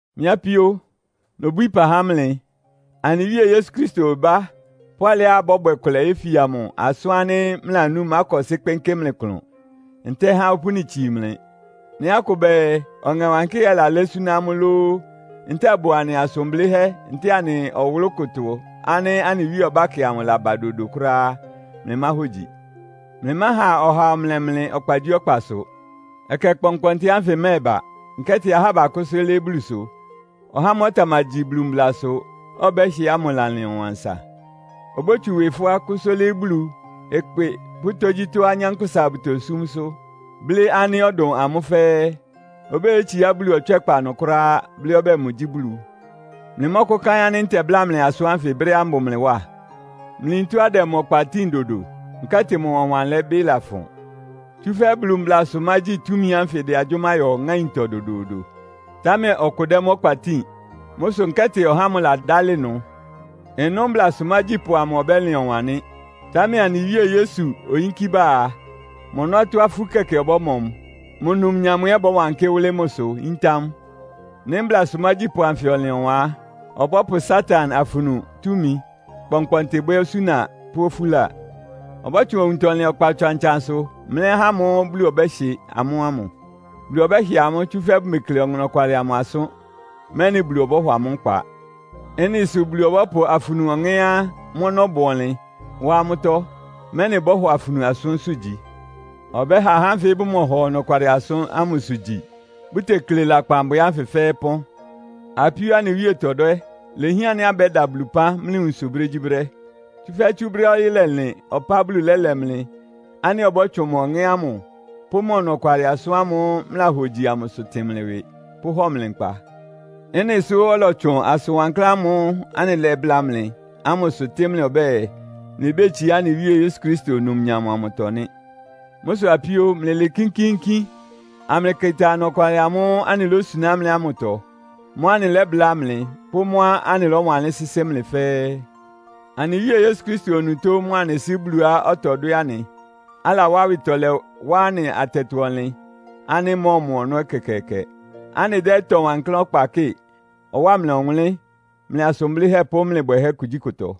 Mɩ́ apíó, nobwíí ɩpa há mlɩ. Anɩ Wíe Yesu Kristo ɩbá, pʋ́ alɩá abɔ́bwɛ kʋlɛ yéfia mʋ asʋ́n ánɩ́ mlɩlanú ɩmákɔsɩ́ kpɩnkɩ́ mlɩ klʋn, ntɛ́ɛ ɩha opúni itsii mlɩ. Nɩ́ akʋ bɛɛ, Ɔŋɛ Wankɩ́hɛ́ lalɛ́ súná amʋ́ lóó, ntɛ́ɛ ɩbʋ anɩ asʋn blɩ́hɛ́ ntɛ́ɛ anɩ ɔwʋlʋ́ kʋtɔ ánɩ́ anɩ Wíe ɔbákɛ amʋ laba dodo kʋ́ráá á, mlɩmáhogyi. Mlɩmáha ɔhaa ɔmlɛ mlɩ ɔkpagyíɔkpasʋ. Ɛkɛ kpɔnkpɔntɩ ánfɩ ɩmɛ́ɛba, nkɛ́tɩ ahá bakʋ́sʋ́ lɩ́ɩ́ Bulusʋ, ɔhá ámʋ́ʋ́ ɔtamagyi Bulu mblasʋ, ɔbɛ́hɩ ámʋ lalɩn ɔwan asa. Obótsu ɩwɩ fʋ́á, kʋ́sʋ́ lɩ́ɩ́ Bulu, ɩkpɩ pʋ́ tógyítɔ́á anyánkpʋ́sa bʋtosúmsʋ́, blɩ́ ánɩ́ ɔdʋn amʋ́ fɛ́ɛ́. Obéyetsiá Bulu ɔtswɛ́kpa ɩnʋ kʋ́ráá, blɩ́ ɔbɛ́ɛ mʋgyí Bulu. Mlɩmɔ́kʋ́káɩ́n ánɩ́ ntɛbláa mlɩ asʋ́n ánfɩ brɛ́á mbʋ mlɩ wá? Mlɩyin tɔ́á ɩdɛ mʋ ɔkpa tíin dodo. Nkɛ́tɩ mʋ ɔwanlɛbɩ́ lafʋn. Tsúfɛ́ Bulu mblasʋmágyi túmi ánfɩ ɩdɛ agyʋ́má yɔ ŋáintɔ dodoodo, támɛ ɔkʋ dɛ́ mʋ́ ɔkpa tíin. Mʋ́ sʋ nkɛ́tɩ ɔhá ámʋ ladálɩ ɩnʋ. Ɩnʋ́ mblasʋ mágyípʋ amʋ ɔbɛ́lɩn ɔwan nɩ́. Támɛ anɩ Wíe Yesu oyínkí ba a, mʋ ɔnɔ́tɔ́ afú kɛkɛ ɩbɔ́mɔ mʋ, mʋ numnyam ɛ́ ɩbɔ́wankɩ́ wʋ́lɩ́ mʋsʋ yíntá mʋ. Nɩ́ mblasʋ mágyípʋ anfɩ ɔlɩn ɔwan á, ɔbɔ́pʋ Satan afunu túmi kpɔnkpɔntɩ bwɛ́ osúna pʋ́ ofúla. Ɔbɔ́tsʋn owuntɔlɩn ɔkpa ɔtsan-ɔtsansʋ mlɛ́ ahá ámʋ́ʋ́ Bulu ɔbɛ́hɩ amʋ́ ámʋ. Bulu ɔbɛ́hɩ amʋ́, tsúfɛ́ bʋmekle ɔnɔkwalɩ amʋ asʋ́n, mɛ́nɩ Bulu ɔbɔ́hɔ amʋ́ nkpa. Ɩ́nɩ sʋ Bulu ɔbɔ́pʋ afunu ɔŋɛ́á mʋ́ ɔnɔ́ bʋ ɔnlɩn wá amʋ́tɔ́, mɛ́nɩ bɔ́hɔ afunu asʋ́nsʋ́ gyi. Ɔbɛ́ha ahá ánfɩ bʋmɔhɔ ɔnɔkwalɩ amʋsʋ gyi, bʋtekle lakpan bwɛ ánfɩ fɛ́ɛ́ ɩpɔ́n. Apíóá anɩ Wíe tɔdwɛ́, ilehián ánɩ́ abɛ́da Bulu ɩpán mlɩ nwunsʋ brégyíbrɛ́. Tsúfɛ́ tsú brɛ́á ɔyɩ́ lɛlɩn ɔpá Bulu lɛ́lɛ mlɩ ánɩ́ ɔbɔ́tsʋn mʋ Ɔŋɛ́ ámʋ pʋ́ mʋ ɔnɔkwalɩ asʋ́n ámʋ́ʋ́ mlɩlahogyi amʋsʋ tɩn mlɩ ɩwɩ, pʋ́hɔ mlɩ nkpa. Ɩ́nɩ sʋ́ ɔlɔtsʋn asʋn wankláán ámʋ́ʋ́ anɩlɛ́bláa mlɩ ámʋsʋ tɩ́ mlɩ ɔbɛ́ɛ, mlɩbétsiá anɩ Wíe Yesu Kristo numnyam amʋtɔ nɩ́. Mʋ́ sʋ apíó, mlɩlɩɩ kínkíínkín, amlɩkɩta ɔnɔkwalɩ amʋ́ʋ́ anɩlósuná mlɩ ámʋtɔ, mʋ́á anɩlɛ́bláa mlɩ pʋ́ mʋ́á anɩlɔ́wanlɩ́n sɩ́sɩ́ mlɩ fɛ́ɛ́. Anɩ Wíe Yesu Kristo onutó mʋa anɩ Sɩ́ Buluá ɔtɔdwɛ́ anɩ, alawá awɩtɔlɛ wá anɩ atɛtɔ-ɔnlɩn ánɩ́ ɩmɔ́ɔmɔ ɔnɔ́ ɛkɛkɛɛkɛ, anɩdɛ́ ɩtɔ wankláán ɔkpa kɩ́ɩ, ɔwáa mlɩ ɔwʋnlɩ́n mlɩ asʋn blɩ́hɛ́ pʋ́ mlɩ bwɛhɛ́ kugyíkʋtɔ.